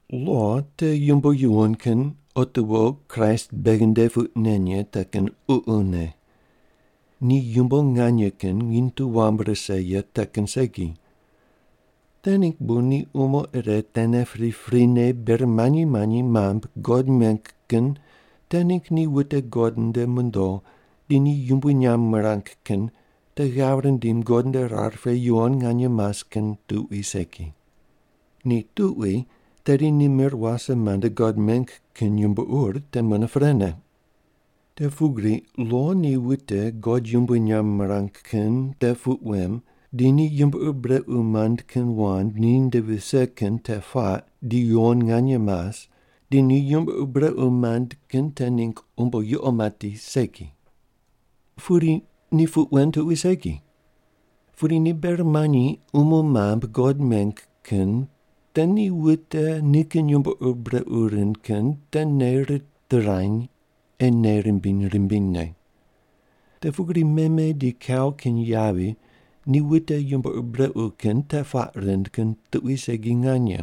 Lo te yumbo yuwon kin otiwo Kraist beghi nde puq nen ye te kin ququne. Ni yumbo nganye kin nginy tu wam rise ye te kin segi. Te ningg bu ni umo ire tene priprine ber manyi manyi mambui God meng kin te ningg ni wute God nde mondo di ni yumbui nyamb mirang kin te ghav rindim God nde rar pe yuwon nganye mas kin tuqui segi. Ni tuqui tedi ni mir wase mande God meng kin yumbo ur te mune prene. Te pugri lo ni wute God yumbui nyamb mirang kin te puq wem di ni yumbo ur brequ mand kin wand ni nde vise kin te puaq di yuwon nganye mas, di ni yumbo ur brequ mand kin te ningg umbo yuqo mati segi. Pudi ni puq wen tuqui segi. Pudi ni ber manyi umo mambui God meng kin te ni wute nikin yumbo ur brequ rind kin te nei ritirany ei nei rimbiny rimbinyne. Te pugri meme di kau kin yavi ni wute yumbo ur brequ kin te puaq rind kin tuqui segi nganye.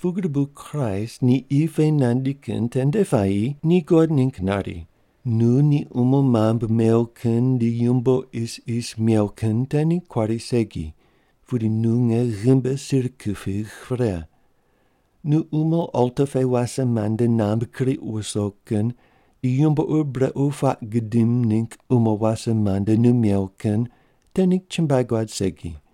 Pugri bu Kraist ni qi pe nandi kin tende puayi ni God ningg nari, Nu ni umo mambui mew kin di yumbo isis mew kin te ningg kuari segi, pudi nu nge ghimbi sir kupigh pre. Nu umo alta pe wase mande namb kriq ruso kin di yumbo ur brequ puaq gudim ningg umo wase mande nu mew kin te ningg chumbuai guad segi.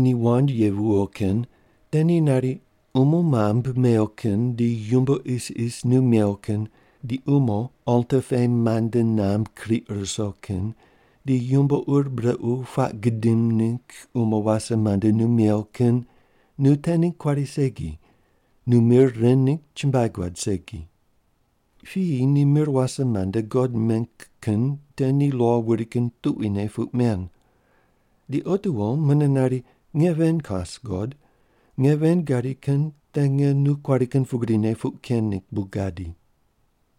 Ni wand ye viyo kin te ni nari, “Umo mambui mew kin di yumbo isis nu mew kin, di umo alta pe mande namb kriq ruso kin, di yumbo ur brequ puaq gudim ningg umo wase mande nu mew kin nu te ningg kuari segi, nu mir ren ningg chumbuai guad segi.” Piyi ni mir wase mande God meng kin te ni lo wuri kin tuquine puq men. Di otiwo mune nari, “Nge ven kas, God. Nge ven gadi kin te nge nu kuari kin pugrine puq ken ningg bu gadi.”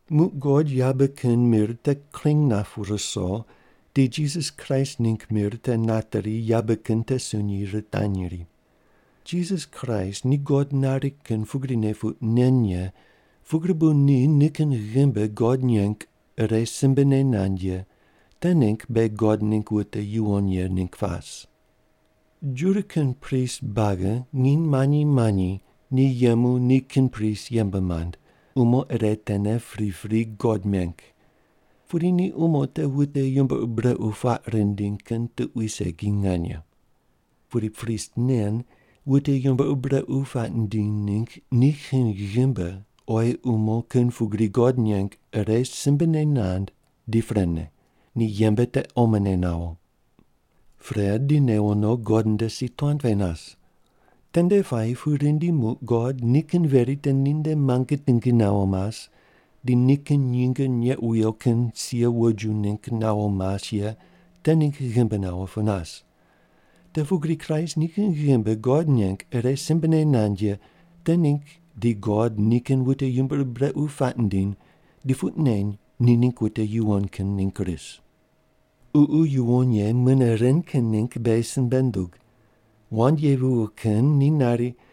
Muq God yabe kin mir te kring nap ruso di Jisas Kraist ningg mir te nateri yabe kin te sunyi ritanyri. Jisas Kraist ni God nari kin pugrine puq nen ye pugri bu ni nikin ghimbi God neng ire simbene nand ye te ningg beghi God ningg wute yuwon ye ningg pas. Juda kin prist buagi nginy manyi manyi ni yemu nikin prist yembe mand, umo ire tene pripri God meng. Pudi ni umo te wute yumbo ur brequ puaq rindiny kin tuqui segi nganye. Pudi prist nen wute yumbo ur brequ puaq nindiny ningg nikin ghimbi oyi umo kin pugri God neng ire simbene nand di prene, ni yembe te omone nawo. Pre di newo no God nde si tuan pe nas. Tende puayi pu rindi muq God nikin veri te ninde muange tingi nawo mas di nikin nyinge neq wuyo kin sia woju ningg nawo mas ye te ningg ghimbi nawo pu nas. Te pugri Kraist nikin ghimbi God neng ire simbene nand ye te ningg di God nikin wute yumbo ur brequ puaq nindiny di puq neny ni ningg wute yuwon kin ningg ris. Ququ Yuwon Ye mune ren kin ningg beghi simbe nundug. Wand ye viyo kin ni nari,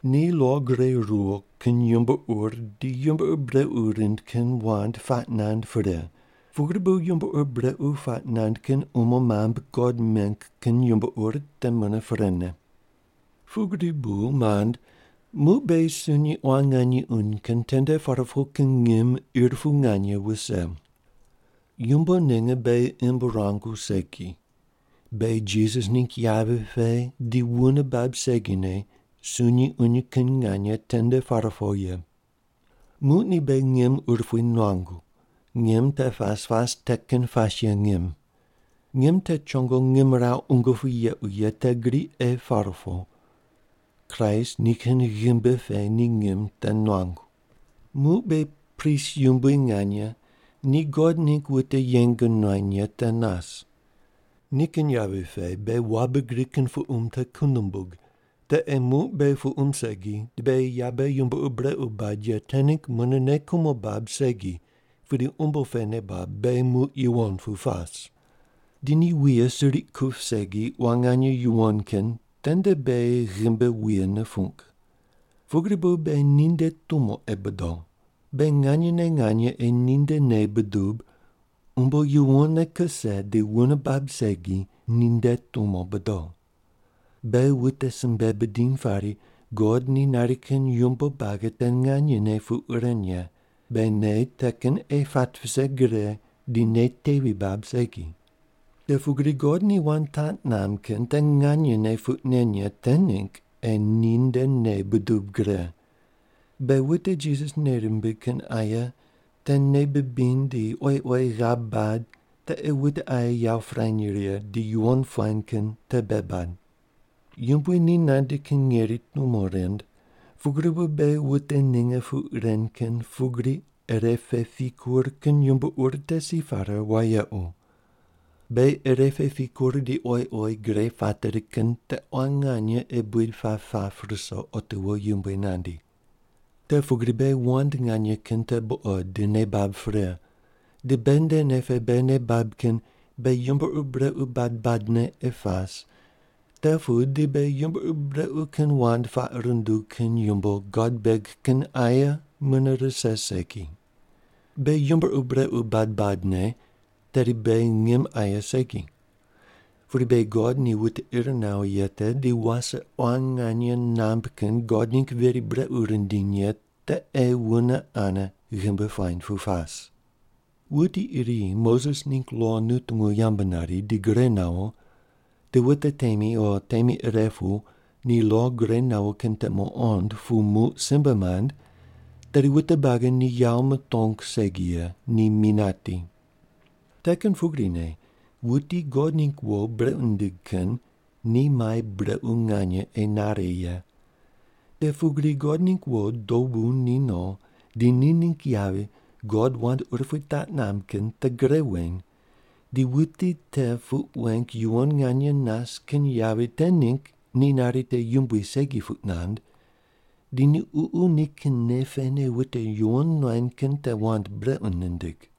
Ni lo gure ruwo kin yumbo ur di yumbo ur brequ rind kin wand puaq nand pre, pugri bu yumbo ur brequ puaq nand kin umo mambui God meng kin yumbo ur te mune prene. Pugri bu mand, muq beghi sunyi quan nganye uny kin tende par po kin ngim ir pu nganye wuse. Yumbo ninge beghi imb ruangu segi. Beghi Jisas ningg yavi pe di wune bab segine sunyi uny kin nganye tende par po ye. Muq ni beghi ngim urupui nuangu. Ngim te pas pas te kin pas ye ngim. Ngim te chongo ngimrawu qungu pu yequ ye te gri ei par po. Kraist nikin ghimbi pe ni ngim te nuangu. Muq beghi prist yumbui nganye ni God ningg wute yeng nuany ye te nas. Nikin yavi pe beghi wabe gri kin puqum te ku numbug, te ei muq beghi puqum segi di beghi yabe yumbo ur brequ bad ye te ningg mune nei kumo bab segi pudi umbo pe nei bab beghi muq yuwon pu pas. Di ni wuye suriq kup segi quan nganye yuwon kin tende beghi ghimbi wuye nupung. Pugri bu beghi ninde tumo ei bodo. Beghi nganyene nganye ei ninde nei budub, umbo yuwonne kuse di wune bab segi ninde tumo bodo. Beghi wute simbe bidiny pari God ni nari kin yumbo buagi te nganyene puq ren ye, beghi nei te kin ei pat vise gre di nei tevi bab segi. Te pugri God ni wand taq namb kin te nganyene puq nen ye te ningg ei ni nde nei budub gre. Beghi wute Jisas nei rimbig kin aye te nei bibiny di oyi oyi ghav bad te ei wute aye yawo pirany righe di yuwon puany kin te bei bad. Yumbui ni nandi kin ngeri tumo rind pugri bu beghi wute ninge puq ren kin pugri ire pe pikur kin yumbo ur te si pare wayequ. Beghi ire pe pikur di oyi oyi gre pateri kin te quan nganye ei buid pap pap ruso otiwo Yumbui nandi. Te pugri beghi wand nganye kin te buqod di nei bab pre, di beghi nde nei pe beghi nei bab kin beghi yumbo ur brequ bad badne ei pas, te pu di beghi yumbo ur brequ kin wand puaq rundug kin yumbo God beg kin aye mune rise segi. Beghi yumbo ur brequ bad badne tedi beghi ngim aye segi, pudi beghi God ni wute ir nawo ye te di wase quan nganye namb kin God ningg veri brequ rindiny ye te ei wune ane ghimbi puany pu pas. Wuti iri Moses ningg lo nutungu yambu nari di gure nawo, di wute temi o temi ire pu ni lo gure nawo kin te muqond pu muq simbe mand, tedi wute buagi ni yawo mutong segi ye, ni mi nati. Te kin pugrine wuti God ningg wo brequ nindig kin ni mai brequ nganye ei nare ye. Te pugri God ningg wo dobu ni no, di ni ningg yavi God wand urupui taq namb kin te gre weny di wuti te puq weng yuwon nganye nas kin yavi te ningg ni nari te yumbui segi puq nand, di ni Ququ nikin nei pene wute yuwon nuany kin te wand brequ nindig.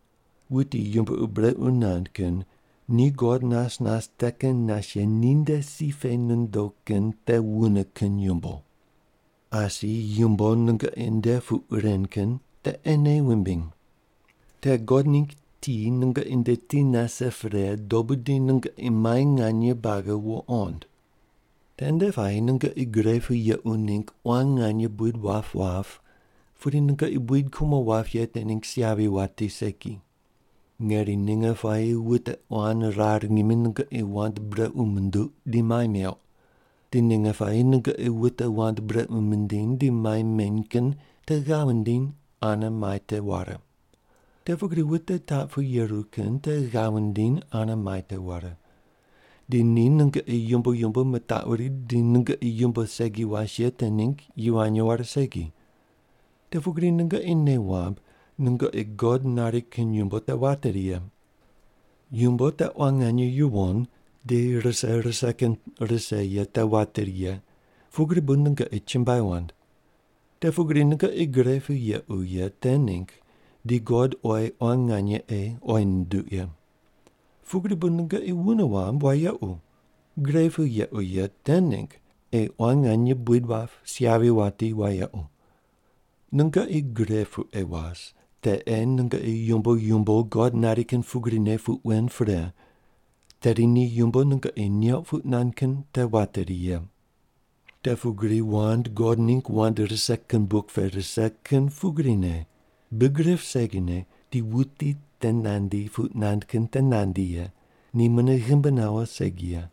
Wuti yumbo ur brequ nand kin ni God nas nas te kin nas ye ninde si pe nondo kin te wune kin yumbo. Asi yumbo nungoqi nde puq ren kin te ei nei wumbiny. Te God ningg ti nungoqi nde ti nase pre dobu di nungoqi mai nganye buagi wuqond. Tende puayi nungoqi gre pu yequ ningg quan nganye buid wap wap pudi nungoqi buid kumo wap ye te ningg si yavi wati segi. Ngeri ninge puayi wute quan rar ngimi nungoqi wand brequ munduq di mai meuq. Di ninge puayi nungoqi wute wand brequ mindiny di mai meny kin te ghav wundiny ane mai te ware. Te pugri wute taq pu yeru kin te ghav wundiny ane mai te ware. Di ni nungoqi yumbo yumbo mitaquri di nungoqi yumbo segi was ye te ningg yivany ware segi. Te pugri nungoqi nei wamb nungoqi God nari kin yumbo te wateri ye. Yumbo te quan nganye yuwon di rise rise te kin rise ye te wateri ye pugri bu nungoqi chumbuai wand. Te pugri nungoqi gre pu yequ ye te ningg di God oyi quan nganye ei oyi nunduq ye. Pugri bu nungoqi wune wamb wayequ, gre pu yequ ye te ningg ei quan nganye buid wap, si yavi wati wayequ. Nungoqi gre pu ei was, te ei nungoqi yumbo yumbo God nari kin pugrine puq wen pre, tedi ni yumbo nungoqi neuq puq nand kin te wateri ye. Te pugri wand God ningg wand rise kin buk pe rise kin pugrine, Big rip segine di wuti te nandi puq nand kin te nandi ye, ni mune ghimbi nawo segi ye.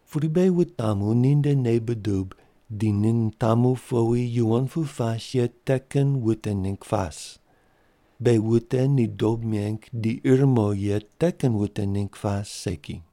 Pudi beghi wutamu ni nde nei budub di ni nitamu powi yuwon pu pas ye te kin wute ningg pas. Beghi wute ni dob meng di ir mo ye te kin wute ningg pas segi.